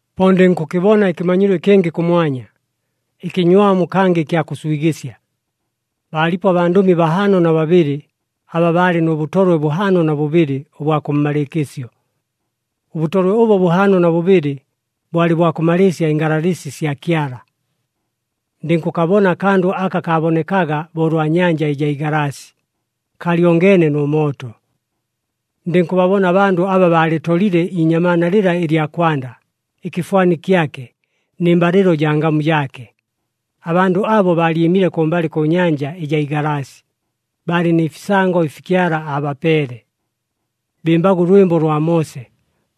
Po ndɨnkʉkɨbona ɨkɨmanyilo ɨkɨngɨ kʉmwanya, ɨkɨnywamu kangɨ ɨkya kʉswigɨsya. Baalipo abandʉmi bahaano na babɨlɨ aba baalɨ nʉ bʉtolwe bʉhaano na bʉbɨlɨ ʉbwa kʉmmalɨɨkɨsyo. Ʉbʉtolwe ʉbo bʉhaano na bʉbɨlɨ, bwalɨ bwa kʉmalɨɨsya ɨngalalɨsi sya Kyala. Ndɨnkʉkabona akandʉ aka kaabonekaga bo ʉlwa nyanja ɨjaa igalaasi, kaalyongeene nʉ mooto. Ndɨnkʉbabona abandʉ aba baalɨtolile iinyamaana lɨla ɨlya kwanda, ɨkɨfwani kyake, nɨ mbalɨlo jaa ngamu jaake. Abandʉ abo baalyɨmile kʉmbalɨ kʉ nyanja ɨjaa igalaasi, baalɨ nɨ fisango ɨfi Kyala aabapeele. Bɨmbaga ʉlwɨmbo lwa Moose,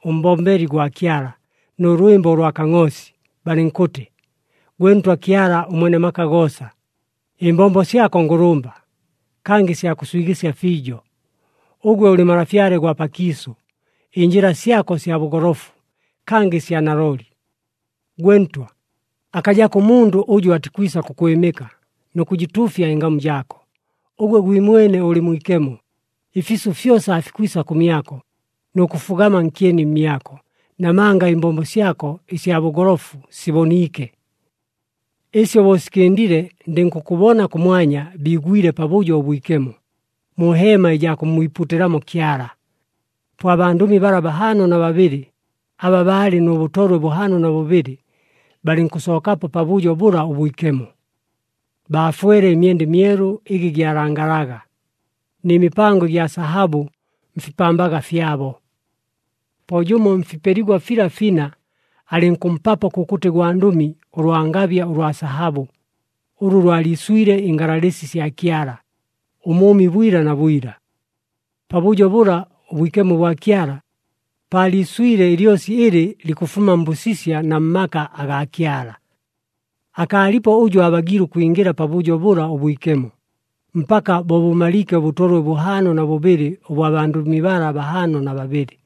ʉmbombeli gwa Kyala, nʉ lwɨmbo ʉlwa Kangʼoosi, balɨnkʉtɨ, “Gwe Ntwa Kyala ʉMwene maka goosa, ɨmbombo syako ngʉlʉmba, kangɨ sya kʉswigɨsya fiijo! Ʉgwe ʉlɨ Malafyale gwa pakiisʉ, ɨnjɨla syako sya bʉgolofu, kangɨ sya nalooli! Gwe Ntwa, akajako ʉmundʉ ʉjʉ atikwisa kʉkwɨmɨka, nʉ kʉjɨtuufya ɨngamu jaako! Ʉgwe gwimwene ʉlɨ mwikemo! Ɨfiisʉ fyosa aafikwisa kʉmyako, nʉ kʉfugama nkyeni mmyako, namanga ɨmbombo syako ɨsya bʉgolofu siboniike.” Ɨsyo bo sikɨndile, ndɨnkʉkʉbona kʉmwanya biigwile Pabʉjo ʉBwikemo mu heema ɨjaa kʉmmwipuutɨlamo Kyala. Po abandʉmi bala bahaano na babɨlɨ aba baalɨ nʉ bʉtolwe bʉhaano na bʉbɨlɨ, balɨnkʉsookapo Pabʉjo bʉla ʉBwikemo. Baafwele ɨmyenda ɨmyelu ɨgɨ gyalangalaga, nɨ mipango ɨgya sahabʉ mfipambaga fyabo. Po jʉmo mfipeligwa fila fina alɨnkʉmpapo kʉkʉtɨ gwandʉmi ʉlwangabya ʉlwa sahabʉ, ʉlʉ lwaliiswile ɨngalalɨsi sya Kyala, ʉmʉʉmi bwila na bwila. Pabʉjo bʉla ʉBwikemo bwa Kyala, paaliiswile ɨlyosi ɨlɨ likʉfuma mbʉsisya na mmaka agaa Kyala. Akaalipo ʉjʉ aabagiile ʉkwingɨla Pabʉjo bʉla ʉBwikemo, mpaka bo bʉmaliike ʉbʉtolwe bʉhaano na bʉbɨlɨ ʉbwa bandʉmi bala bahaano na babɨlɨ.